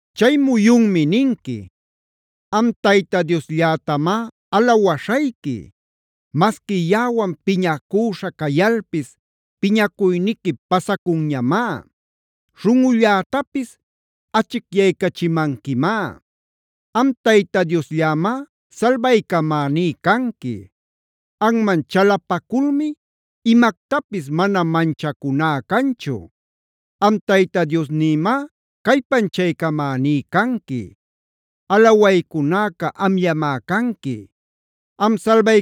Chay muyunmi ninqui: “Am Tayta Diosllätamá alawaśhayqui. Masqui yaꞌawan piñacüśha cayalpis piñacuyniqui pasacunñamá. Śhunꞌullätapis achicyaycachimanquimá. Am Tayta Diosllämá salbaycamaní canqui. Anman chalapaculmi imactapis mana manchacuná canchu. Am Tayta Diosnïmácallpanchaycamäní canqui; alawaycunäca amllamá canqui. Am,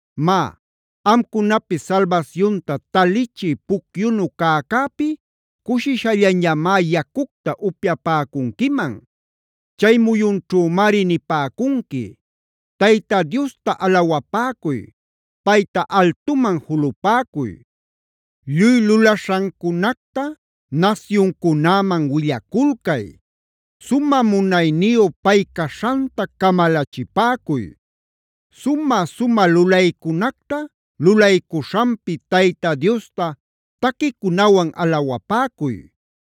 Má, amcunapis salbasyunta talichï pucyunu cäcäpi cushishallañamá yacucta upyapäcunquiman. Chay muyunćhümari nipäcunqui: “¡Tayta Diosta alawapäcuy! ¡Payta altuman julupäcuy! ¡Lluy lulaśhancunacta nasyuncunäman willaculcay! ¡Sumä munayniyu pay caśhanta camalachipäcuy! Sumä-sumä lulaycunacta lulaycuśhanpi Tayta Diosta taquicunawan alawapäcuy.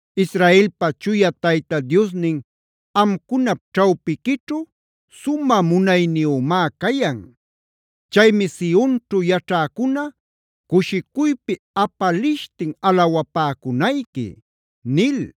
Israelpa Chuya Tayta Diosnin amcunap ćhawpiquićhu sumä munayniyümá cayan. Chaymi Sionćhu yaćhäcuna cushicuypi apalishtin alawapäcunayqui” nil.